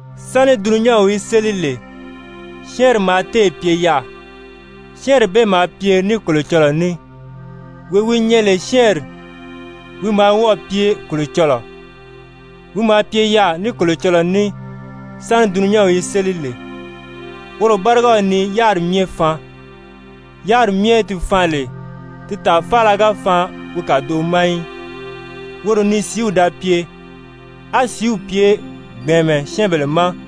Sáni dulunyanw í séli lè, Syɛ́ɛnri maa téè pye yaà, Syɛ́ɛnri bee maa pye ní Kolocɔlɔɔ ní, wee wi nyɛ lè Syɛ́ɛnri, wi maa wɔ́ɔ̀ pye Kolocɔlɔɔ. Wi maa pye yaà ní Kolocɔlɔɔ ní sáni dulunyanw í séli lè. Woro bárigaw ni yáriri myɛ faan, yáriri myɛ di faan lè, di tàa faala ga faan wi kàdoʔo ma í. Woro ni sìíw da pye, á sìíw pye gbɛ̀ɛnmɛ syɛ́ɛnbèle ma.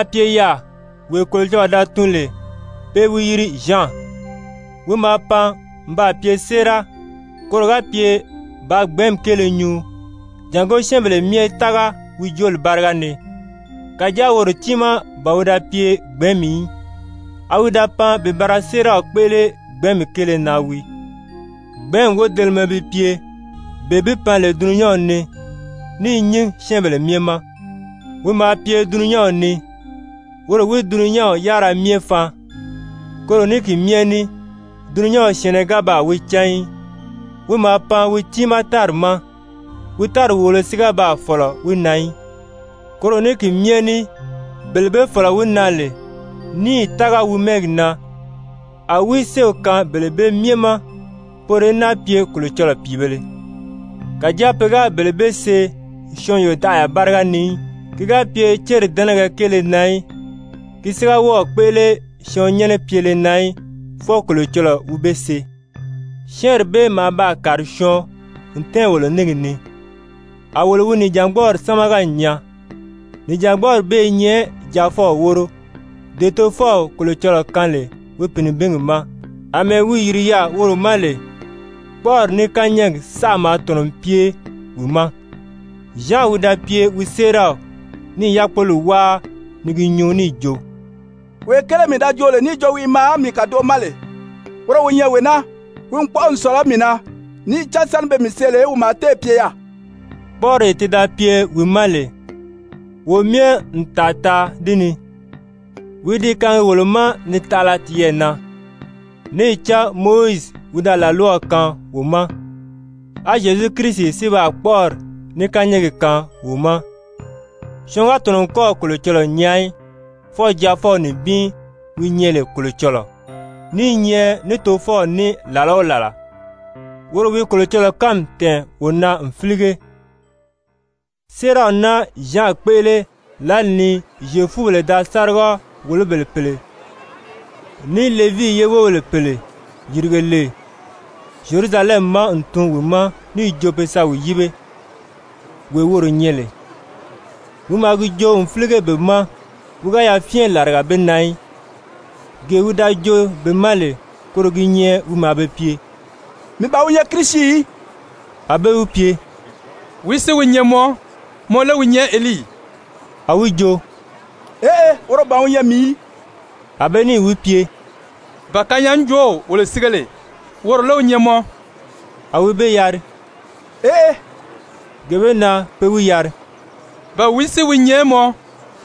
Nànwaa maa pye yaà wee Kolocɔlɔɔ da tun lè pe i wi yiri Zyan. Wi maa pan n baa pye séera, koro ga pye bàā Gbɛ̀ɛ́nmi kéele nyuu, jàngó syɛ́ɛnbèle myɛ í tága wi jooli báriga ni. Kàjáa woro tiimaa ban wi da pye Gbɛ̀ɛ́nmi í, a wi da pan bi ba ra séeraw kpéʔele Gbɛ̀ɛ́nmi kéele na wii. Gbɛ̀ɛ́nmi wodelemɛ bi pye, bee bi pan lè dulunyanw ni, ní i nyín syɛ́ɛnbèle myɛ ma. Wi maa pye dulunyanw ni, woro wi dulunyanw yárira myɛ faan. Koro ní ki myɛ ní dulunyanw syɛ̀ɛnnɛ ga baa wi cán í. Wi maa pan wi tiimaa tári ma. Wi tári wòolo si ga baa fɔ̀lɔ wi na í. Koro ní ki myɛ ní bele be fɔ̀lɔ wi na lè níì tága wi mɛ́ɛgi na, a wi séew kaan bele bee myɛ ma, poro í náa pye Kolocɔlɔɔ pìibēle. Kàjáa pe ga bele bee see syɔɔn yodaʔaya báriga ni í, ki ga pye céri dɛ́nɛgɛ kéele na í, ki si ga wɔ́ɔ̀ kpéʔele syɔɔn nyɛ́nɛ pyele na í, fwɔɔ Kolocɔlɔɔ wi be see. Syɛ́ɛnri bee maa baa kàri syɔɔn n tɛ́ɛn wolo níngi ni, a wolo wi nìjangbɔɔri sámaga n nyaa, nìjangbɔɔri bee i nyɛ Jaafɔw wóro, dee Tofɔw Kolocɔlɔɔ kaan lè wi Pìinibingi ma, àmɛɛ wi yìri yaà woro ma lè. Kpɔ́ʔɔri ní kányɛɛgi saʔa maa tɔ̀nɔ n pye wi ma. Zyan wi da pye wi séeraw, ní i yákpoli wáa ni gi nyuu níì jo: «Wee kéele mii da joo lè níì jo wi i maa mii kàdoʔo ma lè, woro wi nyɛ wee naa, wi n kpɔ́ʔɔ n sɔ̀lɔ mii na, níì cán sáni pe mii see lè wi maa téè pye yaà.» Kpɔ́ʔɔree ti da pye wi ma lè, wo myɛ n tàa taa di ni, wi i di kaangi wolo ma ni taʔala tiyɛɛ na. Níì cán Mowizi wi da làlwaw kaan wo ma, á Zyezu Kirisi si baa kpɔ́ʔɔri ní kányɛɛgi kaan wo ma. Syɔɔn ga tɔ̀nɔ n kɔ́ɔ̀ Kolocɔlɔɔ nyaa í, fwɔɔ Jaafɔw nibin wi nyɛ lè Kolocɔlɔɔ, ní i nyɛ ní Tofɔw ní làla o làla, woro wi Kolocɔlɔɔ kánmi tɛ̀ɛn wo na n fílige. Séeraw naa Zyan kpéʔele lǎli ni Zyefubèle da sáriga-wòlobèle pèle ní Levii ye wóbèle pèle yìrige lè Zyerusalɛmi ma n tun wi ma níì jo be sa wi yíbe, wee woro nyɛ lè. Wi maa gi joo n fílige be ma, wi ga yafyɛn làriga be na í, gee wi da joo be ma lè, koro gi nyɛ wi maa be pye: «Mii ban wi nyɛ Kirisi í.» A be wi pye: «Wìí si wi nyɛ mɔ? Mɔ lé wi nyɛ Elii?» A wi jo: «Eʔe, woro ban wi nyɛ mii í.» A be níì wi pye: «Ba kanyaajoow wolo sige lè, woro lé wi nyɛ mɔ?» A wi be yari: «Eʔe.» Gee bee na pe wi yari: «Ba wìí si wi nyɛ mɔ?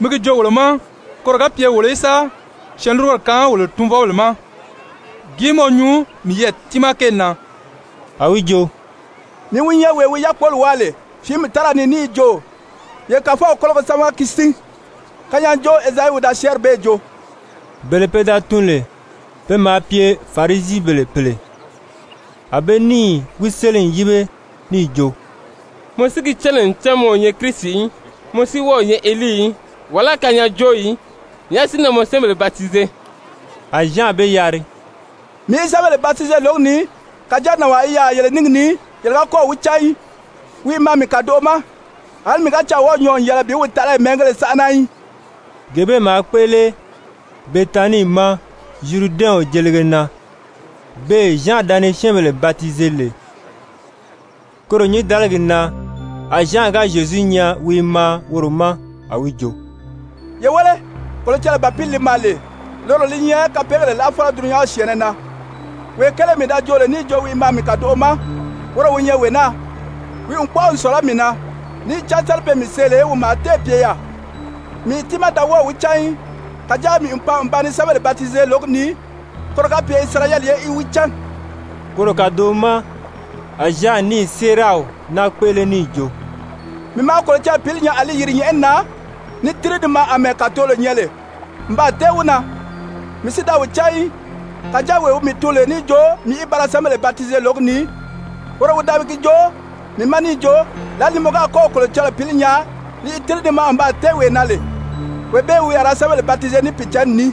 Mi gi joo wolo ma, koro ga pye wolo í sa syɛɛnlurugoro kaan wolo tunvɔbèle ma. Gìí mɔ nyuu miyɛɛ tiimaa kéeli na?» A wi jo: «Mii wi nyɛ wee wi yákpoli wáa lè fìími tára ni níì jo: ‹Ye Kàfɔw kólogo sámaga ki sín.› Kanyaajoow Ezayi wi da syɛ́ɛnri bee joo.» Bele pe da tun lè, pe maa pye Farisibèle pèle. A be níì wi séli n yíbe níì jo: «Mɔ si gi cán lè ncan mɔ o nyɛ Kirisi í, mɔ si wɔ́ɔ o nyɛ Elii í, wàlá kanyaajoow í, nyàʔá si na mɔ syɛ́ɛnbèle batize?» A Zyan be yari: «Mii i syɛ́ɛnbèle batize lǒgi ni. Kàjáa nànwaa i yaà yele níngi ni, yele ga kɔ́ɔ̀ wi cán í, wi i maa mii kàdoʔo ma. Alí mii ga caa wɔ́ɔ̀ nyɔɔ n yɛlɛ bi wi taʔalayi mɛ́ɛngéle sánʔana í.» Gee bee maa kpéʔele Betanii ma Zyuridɛnw jelige na, beè Zyan da ni syɛ́ɛnbèle batize lè. Koro nyǐndaligi na a Zyan ga Zyezu nyaa wi i maa woro ma, a wi jo: «Ye wéle, Kolocɔlɔɔ Bàpili li maa lee, loro li nyɛ kapeegèle láʔafɔlɔ dulunyanw syɛ̀ɛnnɛ na. Wee kéele mii da joo lè níì jo wi i maa mii kàdoʔo ma, woro wi nyɛ wee naa, wi n kpɔ́ʔɔ n sɔ̀lɔ mii na, níì cán sáni pe mii see lè, wi maa téè pye yaà. Mii tiimaa da wɔ́ɔ̀ wi cán í, kàjáa mii n pan n ba ni syɛ́ɛnbèle batize lǒgi ni, koro ga pye Isirayɛli ye í wi cán.» Koro kàdoʔo ma a Zyan níì séeraw naa kpéʔele níì jo: «Mii maa Kolocɔlɔɔ Pǐli nyaa a li yìri nyɛ̀ʔɛni na ni tíri ni maa àmɛɛ kàtolo nyɛ lè n baa tɛ́ɛn wi na. Mii si da wi cán í, kàjáa wee wi mii tun lè níì jo mii í ba ra syɛ́ɛnbèle batize lǒgi ni, woro wi da gi joo mii ma níì jo: ‹Lǎlee ni mɔ ga kɔ́ɔ̀ Kolocɔlɔɔ Pǐli nyaa li i tíri ni maa n baa tɛ́ɛn wee na lè, wee bee wi a ra syɛ́ɛnbèle batize Pìicǎnni ni.›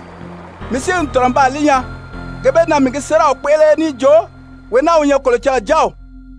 Mii si n tɔ̀nɔ n baa li nyaa, gee bee na mii gi séeraw kpéʔele níì jo wee naa wi nyɛ Kolocɔlɔɔ Jáaw.»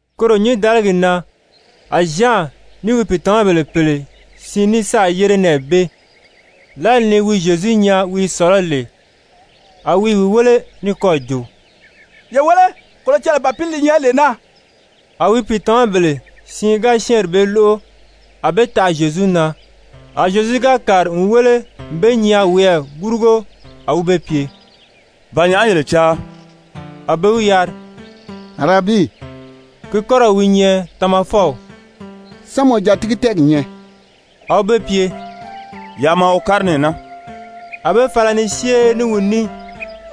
Koro nyǐndaligi na a Zyan ní wi pìitamabèle pèle siin ní sáà yére nɛɛ bee. Lǎli ni wi Zyezu nyaa wi i sɔ̀lɔ́ lè, a wi i wi wéle ní kɔ́ɔ̀ jo: «Ye wéle, Kolocɔlɔɔ Bàpili li nyɛ lee naa.» A wi pìitamabèle siin ga syɛ́ɛnri bee lóʔo, a be taʔa Zyezu na. A Zyezu ga kàri n wéle n be nyaa wiyɛɛ gurugo, a wi be pye: «Ba nyàʔá yele caa?» A be wi yari: «Arabii (ki kɔ́rɔw wi nyɛ Tamafɔw), sán mɔ jatigi-tɛ́ɛgi nyɛ?» A wi be pye: «Yaa maa wo kári nɛɛ naa.» A be fala ni syée ní wi ní.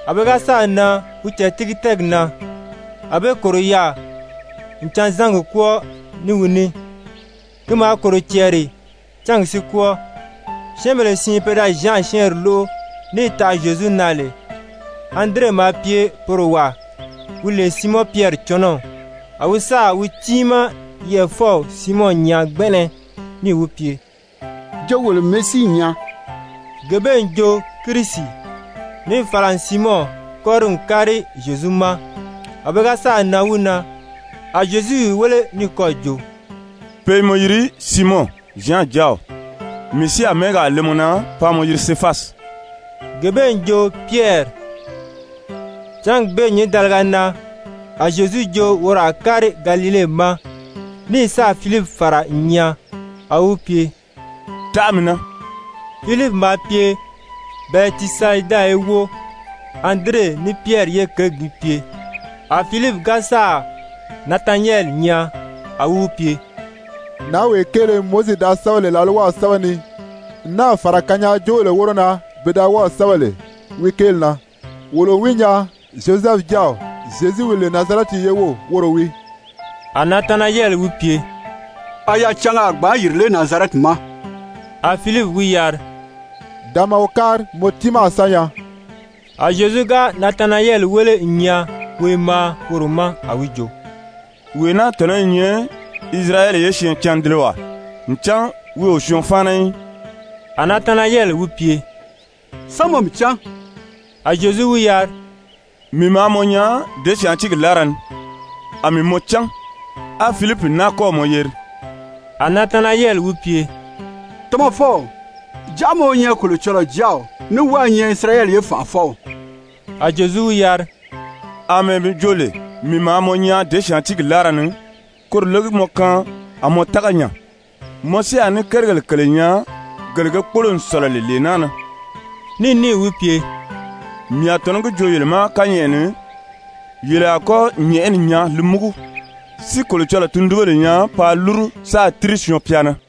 A pe ga sáà nan wi jàtigi-tɛ́ɛgi na, a be kòro yaà n canzangi kwɔ́ɔ ní wi ní. Ki maa kòro cɛɛri cángi si kwɔ́ɔ. Syɛ́ɛnbèle siin pe da Zyan syɛ́ɛnri lóʔo níì taʔa Zyezu na lè, Andire maa pye poro wàa wi lè Siimɔn Pyɛri cɔnɔw. A wi sáà wi tiimaa yɛʔɛfɔw Siimɔn nyaa gbɛnʔɛnɛ, níì wi pye: «Jo wolo n Mesii nyaa.» (Gee bee n jo Kirisi.) Níì fala n Siimɔn kɔ́ri n kári Zyezu ma. A pe ga sáà nan wi na, a Zyezu i wi wéle ní kɔ́ɔ̀ jo: «Pe i mɔ yiri Siimɔn, Zyan jáaw, mii si a mɛ́ɛgaa le mɔ na paa mɔ yiri Sefasi.» (Gee bee n jo Pyɛri.) Cángi bee nyǐndaliga na a Zyezu jo woro a kári Galile ma, ní sáà Filipi fàra n nyaa. A wi wi pye: «Taʔa mii na.» Filipi maa pye Bɛtisayida ye wóo, Andire ní Pyɛri ye kěgi gi pye. A Filipi ga sáà Natanayɛli nyaa, a wi wi pye: «Nǎnwee kéele Mowizi da sɛ́bɛ lè làlwaw sɛ́bɛ ni n náà fàra kanyaajoobèle wóro na pe da wɔ́ɔ̀ sɛ́bɛ lè wi kéeli na, wolo n wi nyaa, Zyozɛfu jáaw Zyezu wi lè Nazarɛti ye wów, woro wii.» A Natanayɛli wi pye: «A yacanga a gbǎn yìri lé Nazarɛti ma?» A Filipi wi yari: «Da maa wo kári, mɔ tiimaa a sa nyaa.» A Zyezu ga Natanayɛli wéle n nyaa wi i maa woro ma, a wi jo: «Wee naa tɔ̀nɔ i nyɛ Isirayɛli ye syɛɛncandelewaa, ncan wi o syɔɔn fáana í.» A Natanayɛli wi pye: «Sán mɔ mii cán?» A Zyezu wi yari: «Mii maa mɔ nyaa děsyaantiigi láara ni, a mii mɔ cán, á Filipi náa kɔ́ɔ̀ mɔ yeri.» A Natanayɛli wi pye: «Tamafɔw, jàʔá mɔ wi nyɛ Kolocɔlɔɔ Jáaw ní wɔ́ɔ i nyɛ Isirayɛli ye Fànʔafɔw.» A Zyezu wi yari: «Amɛɛ mii jo lè mii maa mɔ nyaa děsyaantiigi láara ni, koro lé gi mɔ kaan a mɔ tága nya? Mɔ si a ní kérigèle kèle nyaa gele ge kpólo n sɔ̀lɔ lè lee naa na.» Ní níì wi pye: «Mii a tɔ̀nɔ́ gi joo yele ma kányɛʔɛ ni, yele a kɔ́ nyɛ̀ʔɛni nyaa li múgu, si Kolocɔlɔɔ tundunbèle nyaa paa lúru sáā tíri Syɔɔn-pya na.»